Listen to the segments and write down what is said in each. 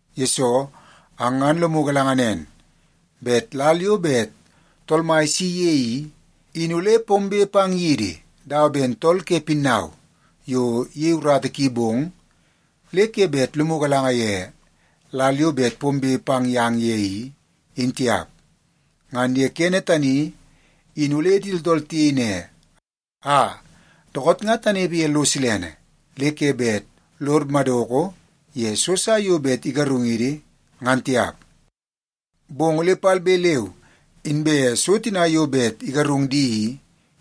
Yesoo, ang ngan lomu galanga nen bet lal yo bet Tool Mai isi ye i, in ole pombe pang yidi dawa ben tool ke pinnau yo iyei urata ki bong, le ke bet lomu galanga ye lal yo bet pombe pang yang ye i, in tiap. Ngan ye kene tani, in ole di tooltool tiyei ne, “Aa, dookoot nga tanepe ye lo silene, le ke bet lod madoko ye so sa yo bet igarungidi ngan tiap.” Bong ole palbe leu inbe so tina yo bet igarung di i,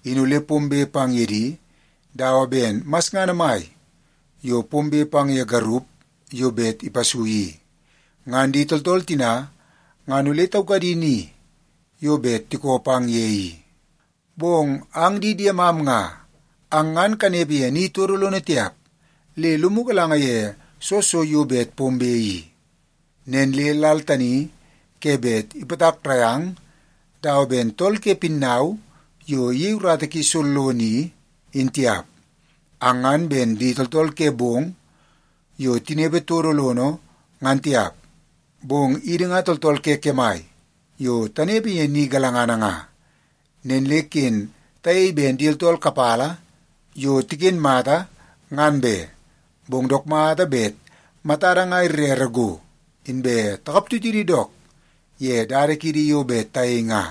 in ole pombe pang ye di dawa ben masngana mai yo pombe pang ye garup yo bet ipasui i. Ngan di tooltool tina ngan ole taukadi ni yo bet tikoo pang ye i. Bong ang di diemam nga, ang ngan kanepe ye ni todo lono tiap le lomu galanga ye soo so yo bet pombe i. Nen le lal tani ke bet ipatakrai ang dawa ben tool ke pinnau yo iyei urata ki sollono i, in tiap. Ang ngan ben di tooltool ke bong yo tinepe todo lono ngan tiap, bong idi nga tooltool ke kemai yo tanepe ye ni galangana nga. Nen le ken tayei ben di tooltool kapala yo tiken mata ngan be, bong dook mata bet matada nga irere go, inbe takap tutidi dook ye dada kiidi yo bet tayei nga.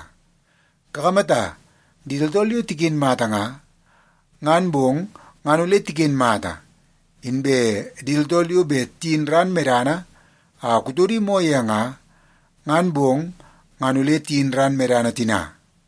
Kakamata, di tooltool yo tiken mata nga, ngan bong ngan ole tiken mata. Inbe di tooltool yo bet tiyin ran medana a kutodi moo ye nga, ngan bong ngan ole tiyin ran medana tina.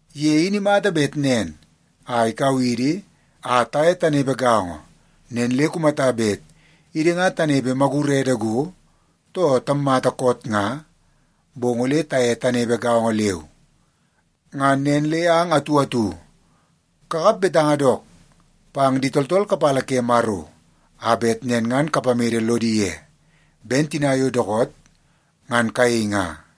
Ye in imata bet nen a ikau idi a taye tanepe gaongo. Nen le kumata bet idi nga tanepe magurede go, too tammata koot nga, bong ole taye tanepe gaongo leu. Ngan nen le ang atu atu kakap betanga dook pang di tooltool kapala ke Maro a bet nen ngan kapamede lodi ye, ben tina yo dookoot ngan kayei nga.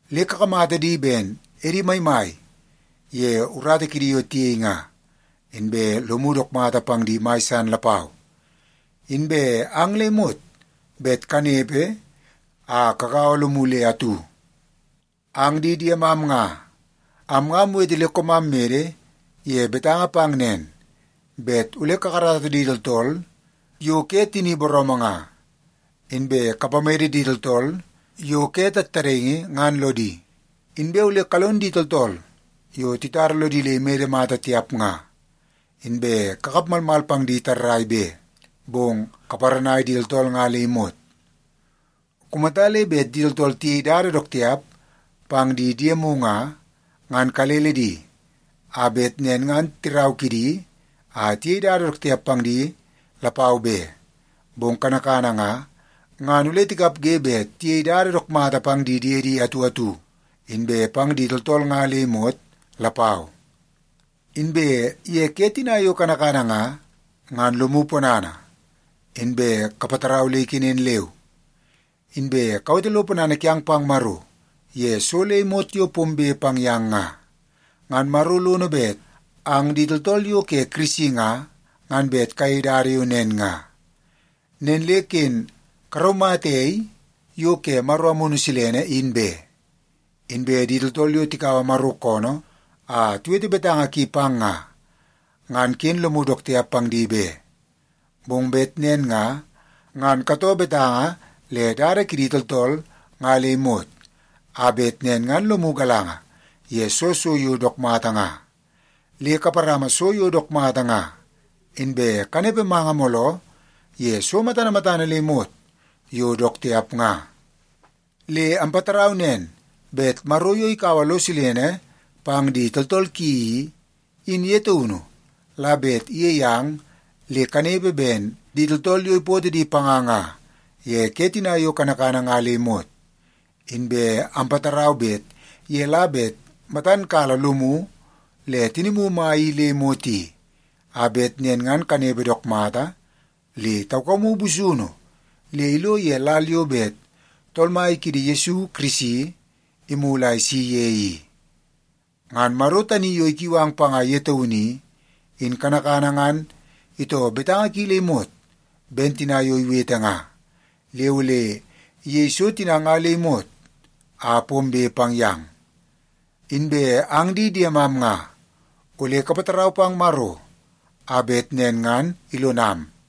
Le kakamata di ben edi maimai ye urata kidi yo tiyei nga, inbe lomu dook mata pang di mai san lapau. Inbe ang le imot bet kanepe a kagaua lomu le atu. Ang di diemam nga, am nga amwete le koomam mede ye betanga pang nen, bet ole kakarata di tooltool yo ke tini booroomoo nga, inbe kapamede di tooltool yo ke tattadaingi ngan lodi. Inbe ole kalon di tooltool yo titara lodi le imede mata tiap nga, inbe kakap malmal pang di tarrai be, bong kaparanai di tooltool nga le imot. Kumata le bet di tooltool tiyei dada dook tiap pang di diemu nga, ngan kalele di a bet nen ngan tirau kidi a tiyei dada dook tiap pang di lapau be. Bong kanakana nga, ngan ole tikapge bet tiyei dada dook mata pang di diedi atu atu, inbe pang di tooltool nga le imot lapau. Inbe ye ke tina yo kanakana nga, ngan lomu ponana, inbe kapatarau le ikenen leu. Inbe kawete lo ponana kiang pang Maro ye so le imot yo pombe pang yang nga. Ngan Maro lono bet ang di tooltool yo ke Yesu Kirisi nga, ngan bet kayei dada yo nen nga. Nen le ken karaumata ei yo ke Maro Amunu Silene in be. Inbe di tooltool yo tikaua Maro koonoo a tiwete betanga ki pang nga, ngan ken lomu dook tiap pang di be. Bong bet nen nga, ngan katouo betanga le dada kidi tooltool nga le imot, a bet nen ngan lomu galanga ye soo so yo dook mata nga. Le kaparama so yo dook mata nga, inbe kanepe manga mooloo ye so matana matana le imot yo dook tiap nga. Le ampatarau nen, bet Maro yo ikaua lo silene pang di tooltool ki i, in ye taunu la bet iyei ang le kanepe ben di tooltool yo ipootoo di panga nga ye ke tina yo kanakana nga le imot. Inbe ampatarau bet ye la bet matan kala lomu le tinimu mai i le imot i, a bet nen ngan kanepe dook mata le taukamu busunu le ilo ye lal yo bet Tool Mai kiidi Yesu Kirisi imulu a isi ye i. Ngan Maro tani yo ikiu ang panga ye taunu i, in kanakana ngan itoo betanga ki le imot ben tina yo iwete nga. Le ole iyei so tina nga le imot a pombe pang yang. Inbe ang di diemam nga, ole kapatarau pang Maro a bet nen ngan ilonam.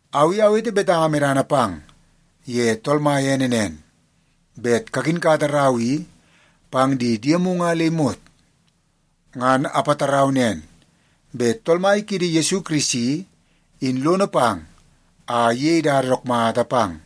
Au i awete betanga medana pang ye Tool Mai ene nen, bet kakinkata rau i pang di diemu nga le imot. Ngan apatarau nen, bet Tool Mai kiidi Yesu Kirisi, in lono pang a iyei dada dook mata pang.